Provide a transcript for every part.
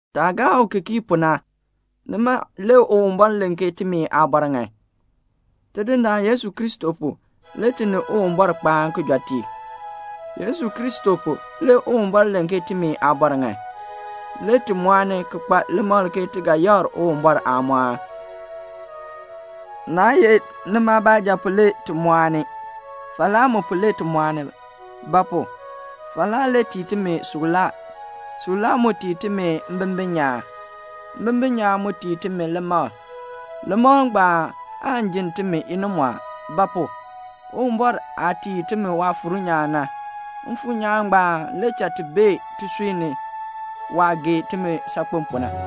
Taah gaa u ki kii pu na, nima le Uwumbɔr len ke timi aabɔr ŋan. Tidindaan Yesu Kristo pu le ti ni Uwumbɔr kpaan kijɔteek. Yesu Kristo pu, le Uwumbɔr len ke timi aabɔr ŋan. Le ti mɔɔni ki kpa limakl ke ti ga yakr Uwumbɔr aamɔɔn. Naa ye nima baanja pu le ti mɔɔni. Falaa mu pu le ti mɔɔni. Ba pu? falaa le tii timi suklaa. Suklaa mu tii timi mbimbin nyaan. Mbimbin nyaan mu tii timi limakl. Limakl ngbaan aan jinn timi inimɔɔn. Ba pu? Uwumbɔr aah tii timi Waafuur nyaan na, Mfuur nyaan ngbaan le cha ti bee tisui ni waah gee timi saakpen pu na.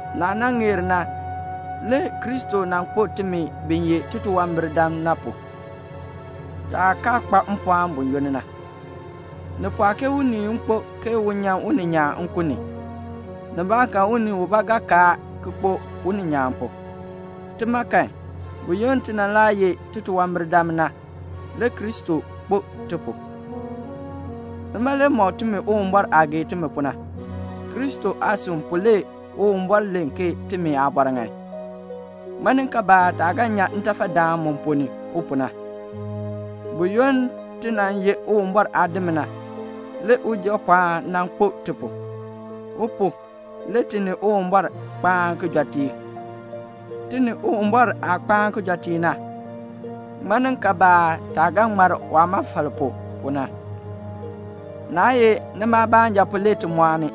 Naah nan ŋeer na, le Kristo nan kpo timi bi ye titunwambirdam na pu, taah kaa kpa mpɔɔn buyoonn na. Ni pɔɔ ke unii kpo ke un nyan uninyaan nkun ni. Nibaakan unii ubaa ga kaar ki kpo uninyaan pu. Tima kan, buyoonn ti nan laa ye titunwambirdam na, le Kristo nan kpo ti pu. Nima le mɔk timi Uwumbɔr aah gee timi pu na. Kristo aasin pu le Uwumbɔr len ke timi aabɔr ŋan. Ŋmaninkaabaa taah ga nyan ntafadaan mu ponn ni u pu na? Buyoonn ti nan ye Uwumbɔr aadim na, le Ujapɔɔn nan kpo ti pu. U pu, le ti ni Uwumbɔr kpaan kijɔteek. Ti ni Uwumbɔr aah kpaan kijɔteek na, ŋmaninkaabaa taah ga ŋmar waamɔfal pu na? Naa ye nima baanja pu le ti mɔɔni.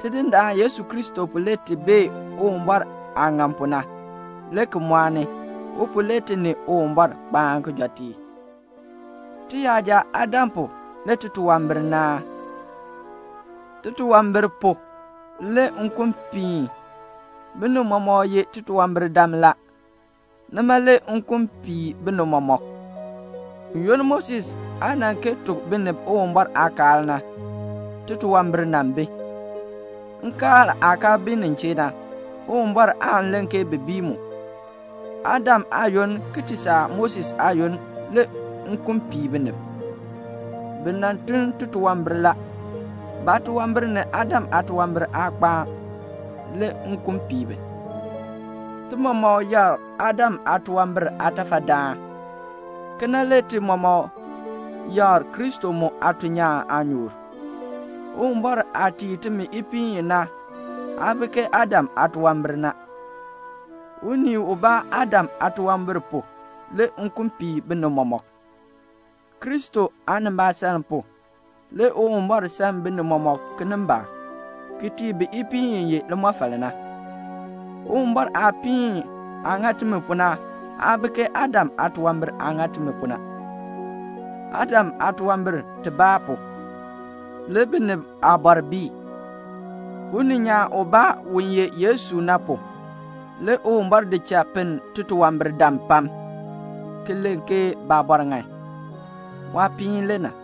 Tidindaan Yesu Kristo pu le ti bee Uwumbɔr aah ŋan pu na, le ki mɔɔni. U pu le ti ni Uwumbɔr kpaan kijɔteek. Tiyaja Adam pu le titunwambir naan. Titunwambir pu le nkun piin. Binib mɔmɔk ye titunwambirdam la. Nima le nkun pii binib mɔmɔk. Buyoonn Moses aa nan kee tuk binib Uwumbɔr aakaal na, titunwambir nan bi. Nkaal aah kaa bi nin chee na, Uwumbɔr aan len ke bi bii mu. Adam aayoonn ki ti saa Moses aayoonn le nkun pii binib. Bi nan tun titunwambir la. Baatunwambir ni Adam aatunwambir aa kpaan. Le nkun pii bi. Ti mɔmɔk yakr Adam aatunwambir aatafadaan. Kena le ti mɔmɔk yakr Kristo mu aatuln nyaan aanyoor. Uwumbɔr aah tii timi ipiin i na aa bi ke Adam aatunwambir na. Unii ubaa Adam aatunwambir pu le nkun pii binib mɔmɔk. Kristo aanimbaasaln pu, le Uwumbɔr san binib mɔmɔk kinimbaak, ki tii bi ipiin i ye limɔfal na. Uwumbɔr aapiin aah ŋa timi pu na aa bi ke Adam aatunwambir aah ŋa timi pu na. Adam aatunwambir tibaa pu, le binib aabɔr bii. Uninyaan ubaa u ye Yesu na pu, le Uwumbɔr di cha pinn titunwambirdam pam, ki len ke baabɔr ŋan. Waapiin le na.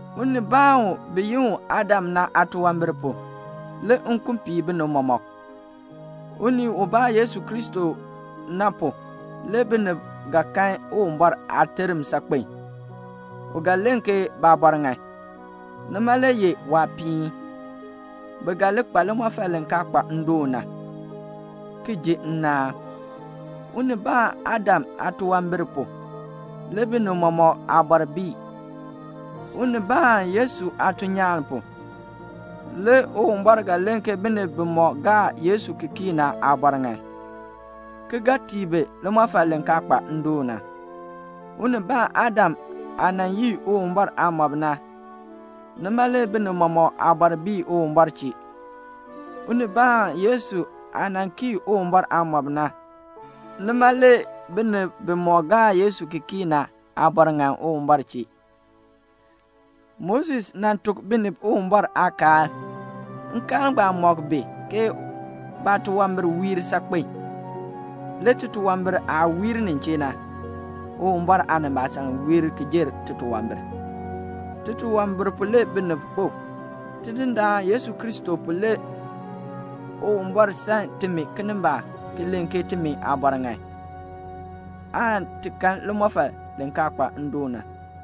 Unii ubaa u bi yi u Adam na aatunwambir pu, le nkun pii binib mɔmɔk. Unii ubaa Yesu Kristo na pu, le binib ga kan Uwumbɔr aaterm saakpen. U ga len ke baabɔr ŋan. Nima le ye waapiin. Bi ga li kpa limɔfal li kaa kpa ndoon na, ki ji nnaan. Unii ubaa Adam aatunwambir pu, le binib mɔmɔk aabɔr bii. Unii ubaa Yesu aatuln nyaan pu, le Uwumbɔr ga len ke binib bimɔk gaa Yesu ki kii na aabɔr ŋan, ki ga tii bi limɔfal li kaa kpa ndoon na. Unii ubaa Adam aah nan yii Uwumbɔr aamɔb na, nima le binib mɔmɔk aabɔr bii Uwumbɔr chee. Unii ubaa Yesu aah nan kii Uwumbɔr aamɔb na, nima le binib bimɔk gaa Yesu ki kii na aabɔr ŋan Uwumbɔr chee. Moses nan tuk binib Uwumbɔr aakaal. Nkaal ngbaan mɔk bi ke baatunwambir wiir saakpen. Le titunwambir aah wiir nin chee na Uwumbɔr aanimbaasaln wiir ki jer titunwambir. Titunwambir pu le binib kpo. Tidindaan Yesu Kristo pu le Uwumbɔr san timi kinimbaak ki len ke timi aabɔr ŋan, aan ti kan limɔfal li kaa kpa ndoon na.